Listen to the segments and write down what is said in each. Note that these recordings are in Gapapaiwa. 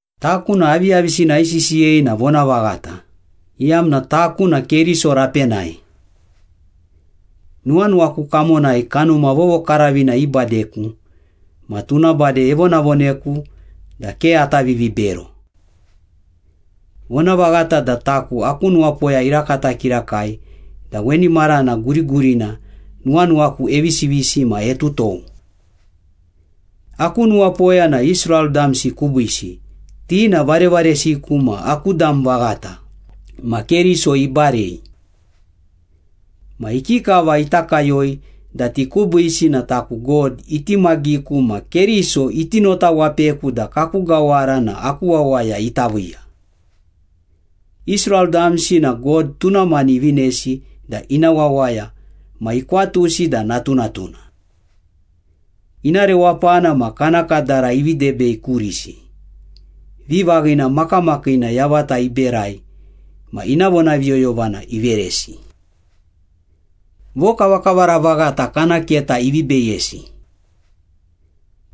Taku na aviyavisina aisisiyei na vonavaghata, iyamna taku na Keriso rapenai. Nuwanuwaku kamonai Kanuma Vovokaravina ibadeku, ma tuna bade evonavoneku da ke ata vivibero. Vonavaghata da taku aku nuwapoya irakata kirakai da weni marana gurigurina nuwanuwaku evisivisi ma etutou. Aku nuwapoya na Israel damsi kubiisi, ti na varevaresiku ma aku dam vaghata ma Keriso ibarei. Ma ikikava ita kayoi da ti kubiisi na taku God itimagiku ma Keriso iti notawapeku da kaku gawara na aku wawaya ita viiya. Israel damsi na God tuna mani ivinesi da ina wawaya ma ikwatusi da natunatuna. Ina rewapana ma kana kadara ivi debei kurisi. Vivaghina makamakiina yavata iberai ma ina vonaviyoyovana iveresi. Vokavakavara vaghata kana keta ivi beyesi.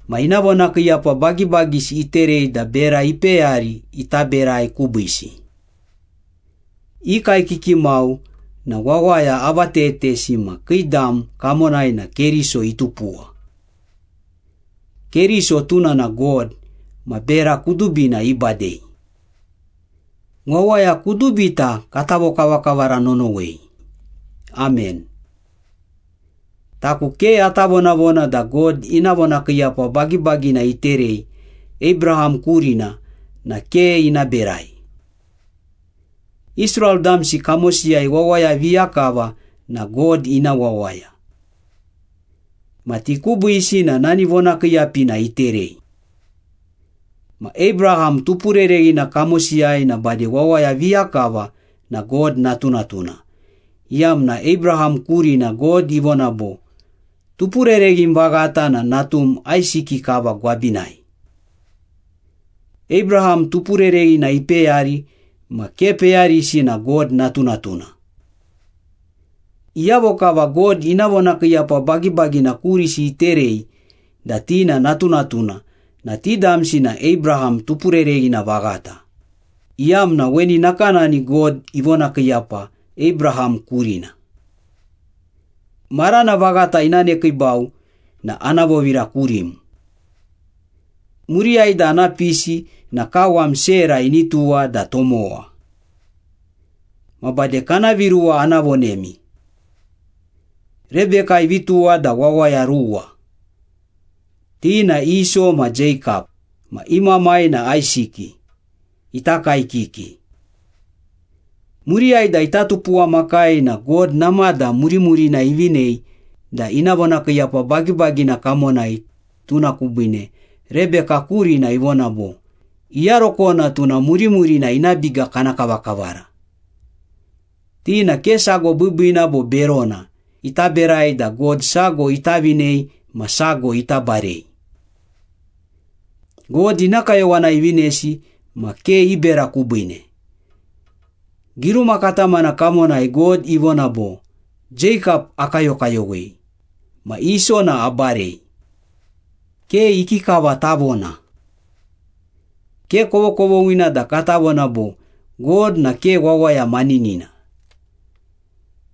Ma ina vonakiiyapa bagibagisi iterei da bera ipeyari ita berai kubiisi. I kaekiki mau na wawaya avatetesi ma kii dam kamonai na Keriso itupuwa. Keriso tuna na God, ma bera kudubina ibadei. Wawaya kudubita kata vokavakavara nonowei! Amen. Taku ke ata vonavona da God ina vonakiiyapa bagibagina iterei Abraham kurina na ke ina berai. Israel damsi kamosiyai wawaya viya kava na God ina wawaya. Ma ti kubiisi na nani vonakiiyapina iterei. Ma Abraham tupurereghina kamosiyai na bade wawaya viya kava na God natunatuna, iyamna Abraham kurina God ivona bo, “Tupurereghim vaghata na natum Aisiki kava gwabinai.” Abraham tupurereghina ipeyari ma ke peyarisi na God natunatuna. Iyavo kava God ina vonakiiyapa bagibagina kurisi iterei da ti na natunatuna na ti damsi na Abraham tupurereghina vaghata, iyamna weni nakanani God ivonakiiyapa Abraham kurina. “Marana vaghata ina nekiibau na ana vovira kurim. Muriyai da ana pisi na kawam Sera ini tuwa da tomowa.” Ma bade kana viruwa ana vonemi. Rebeka ivi tuwa da wawaya ruwa. Ti na Iso ma Jeikap, ma i mamai na Aisiki, ita kaekiki. Muriyai da ita tupuwamakai na God namada murimurina ivinei da ina vonakiiyapa bagibagina kamonai, tuna kubiine Rebeka kurina ivona bo, “Iyarokona tuna murimurina ina biga kana kavakavara.” Ti na ke sago biibiina bo berona ita berai da God sago ita vinei ma sago ita barei. God ina kayowanai ivinesi ma ke i bera kubiine. Giruma katamana kamonai God ivona bo, “Jeikap akayokayowei, ma Iso na abarei.” Ke ikikava tavona. Ke kovokovoghina da kata vona bo, “God na ke wawaya maninina.”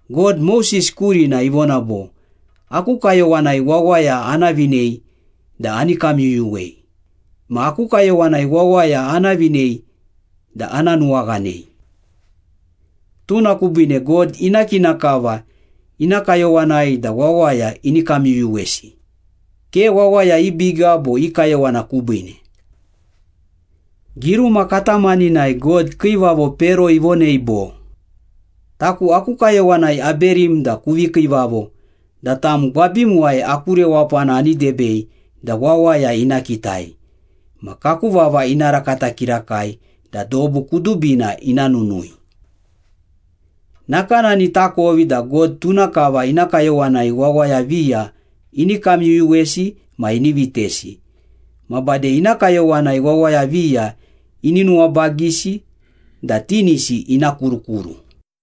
God, Moses kurina ivona bo, “Aku kayowanai wawaya ana vinei da ani kamyuyuwei, ma aku kayowanai wawaya ana vinei da ana nuwaghanei.” Tuna kubiine God ina kina kava ina kayowanai da wawaya ini kamyuyuwesi, ke wawaya i biga bo i kayowana kubiine. Giruma katamaninai God kiivavo Pero ivonei bo, “Taku aku kayowanai aberim da kuvi kiivavo da tam gwabimuwai aku rewapana ani debei da wawaya ina kitai, ma kaku vava ina rakata kirakai da dobu kudubina ina nunui.” Nakanani takovi da God tuna kava ina kayowanai wawaya viya ini kamyuyuwesi ma ini vitesi, ma bade ina kayowanai wawaya viya ini nuwabagisi da tinisi ina kurukuru.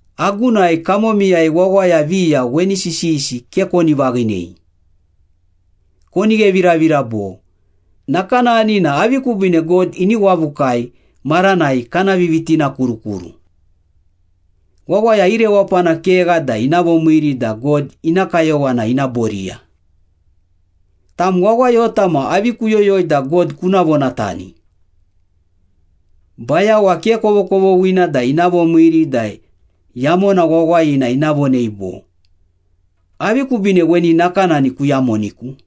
Agunai kamomiyai wawaya viya weni sisiyisi ke koni vaghinei. Koni gheviravira bo, “Nakanani na avi kubiine God ini wavukai maranai kana vivitinakurukuru? Wawaya i rewapana kegha da ina vomiiri da God ina kayowana ina boriya.” Tam wawayota ma avi kuyoyoi da God kuna vonatani? Bayawa ke kovokovoghina da ina vomiiri da yamona wawayina ina vonei bo, “Avi kubiine weni nakanani kuyamoniku?”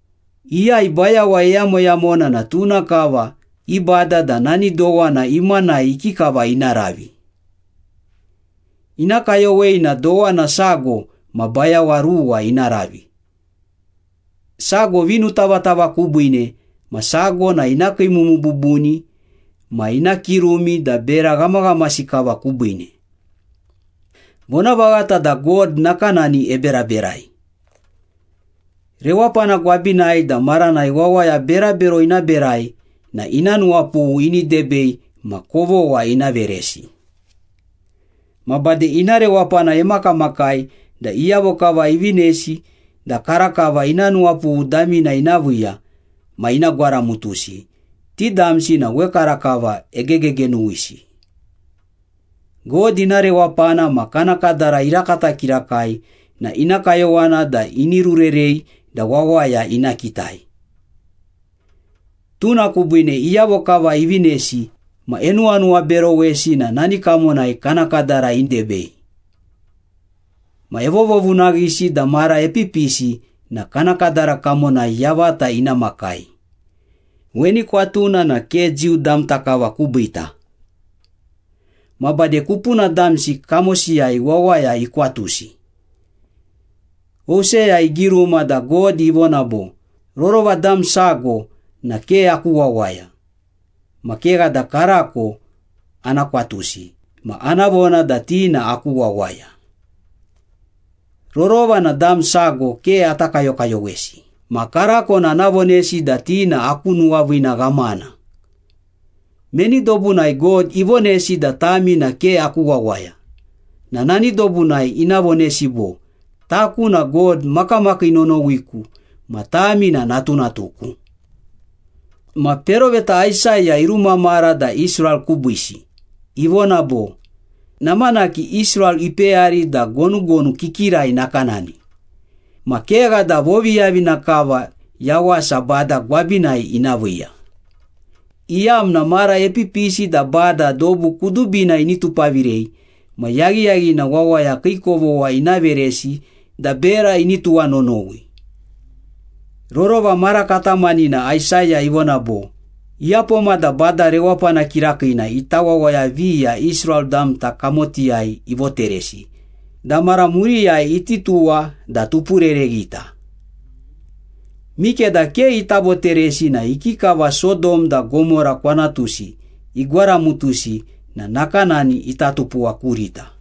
Iyai bayawa eyamoyamona na tuna kava ibada da nani dowana imanai ikikava ina ravi. Ina kayowei na dowana sago ma bayawa ruwa ina ravi, sago vinutavatava kubiine ma sago na ina kiimumu bubuni ma ina kirumi da bera ghamaghamasi kava kubiine. Vonavaghata da God nakanani eberaberai. Rewapana gwabinai da maranai wawaya berabero ina berai na ina nuwapughu ini debei ma kovogha ina veresi. Ma bade ina rewapana emakamakai da iyavo kava ivinesi da karakava ina nuwapughu damina ina viiya ma ina gwaramutusi, ti damsi na wekarakava egegegenuwisi. God ina rewapana ma kana kadara irakata kirakai na ina kayowana da ini rurerei da wawaya ina kitai. Tuna kubiine iyavo kava ivinesi ma enuwanuwaberowesi na nani kamonai kana kadara idebei. Ma evovovunaghisi da mara epipisi na kana kadara kamonai yavata ina makai. Weni kwatuna na ke Jiu damta kava kubiita. Ma bade kupuna damsi kamosiyai wawaya ikwatusi. Hoseya igiruma da God ivona bo, “Rorova dam sago na ke aku wawaya, ma kegha da karako ana kwatusi ma ana vona da ti na aku wawaya. Rorova na dam sago ke ata kayokayowesi, ma karako na ana vonesi da ti na aku nuwaviina ghamana.” Meni dobunai God ivonesi da ‘Tami na ke aku wawaya,’ na nani dobunai ina vonesi bo, ‘Taku na God makamakii nonowiku ma tami na natunatuku.’ Ma peroveta Aisaya irumamara da Israel kubiisi ivona bo, “Namanaki Israel ipeyari da gonugonu kikirai nakanani, ma kegha da voviyavina kava yawasa Bada gwabinai ina viiya, iyamna mara epipisi da Bada dobu kudubina ini tupavirei ma yaghiyaghina wawaya kii kovogha ina veresi da bera ini tuwanonowi.” Rorova mara katamanina Aisaya ivona bo, “Iyapoma da Bada Rewapana Kirakiina ita wawaya viya Israel damta kamotiyai ivoteresi da mara muriyai iti tuwa da tupurereghita. Mikeda ke ita voteresi na ikikava Sodom da Gomora kwanatusi igwaramutusi na nakanani ita tupuwa kurita.”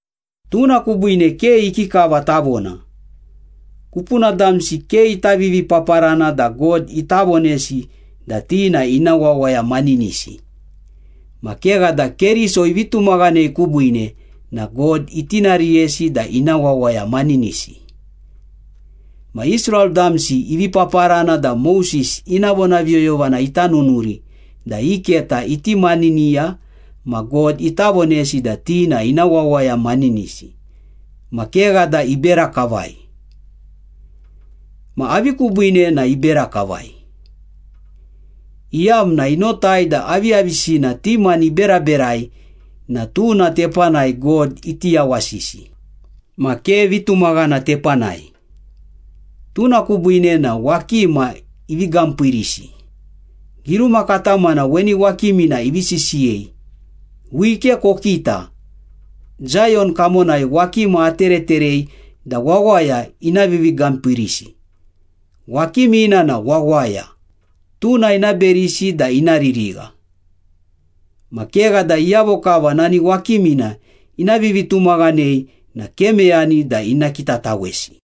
Tuna kubiine, ke ikikava tavona. Kupuna damsi ke ita vivipaparana da God ita vonesi da ti na ina wawaya maninisi, ma kegha da Keriso ivi tumaghanei kubiine na God itinariyesi da ina wawaya maninisi. Ma Israel damsi ivi paparana da Moses ina vonaviyoyovana ita nunuri da i keta iti maniniya ma God ita vonesi da ti na ina wawaya maninisi, ma kegha da ibera kavai. Ma avi kubiine na ibera kavai? Iyamna inotai da aviyavisina ti mani iberaberai na tuna tepanai God iti yawasisi, ma ke vitumaghana tepanai. Tuna kubiine na ‘wakima ivi gampiirisi.’ Giruma katamana weni wakimina ivi sisiyei, “Wike kokita, Zayon kamonai wakima atereterei da wawaya ina vivigampiirisi, wakimina na wawaya, tuna ina berisi da ina ririgha. Ma kegha da iyavo kava nani wakimina ina vivitumaghanei na ke meyani da ina kitatawesi.”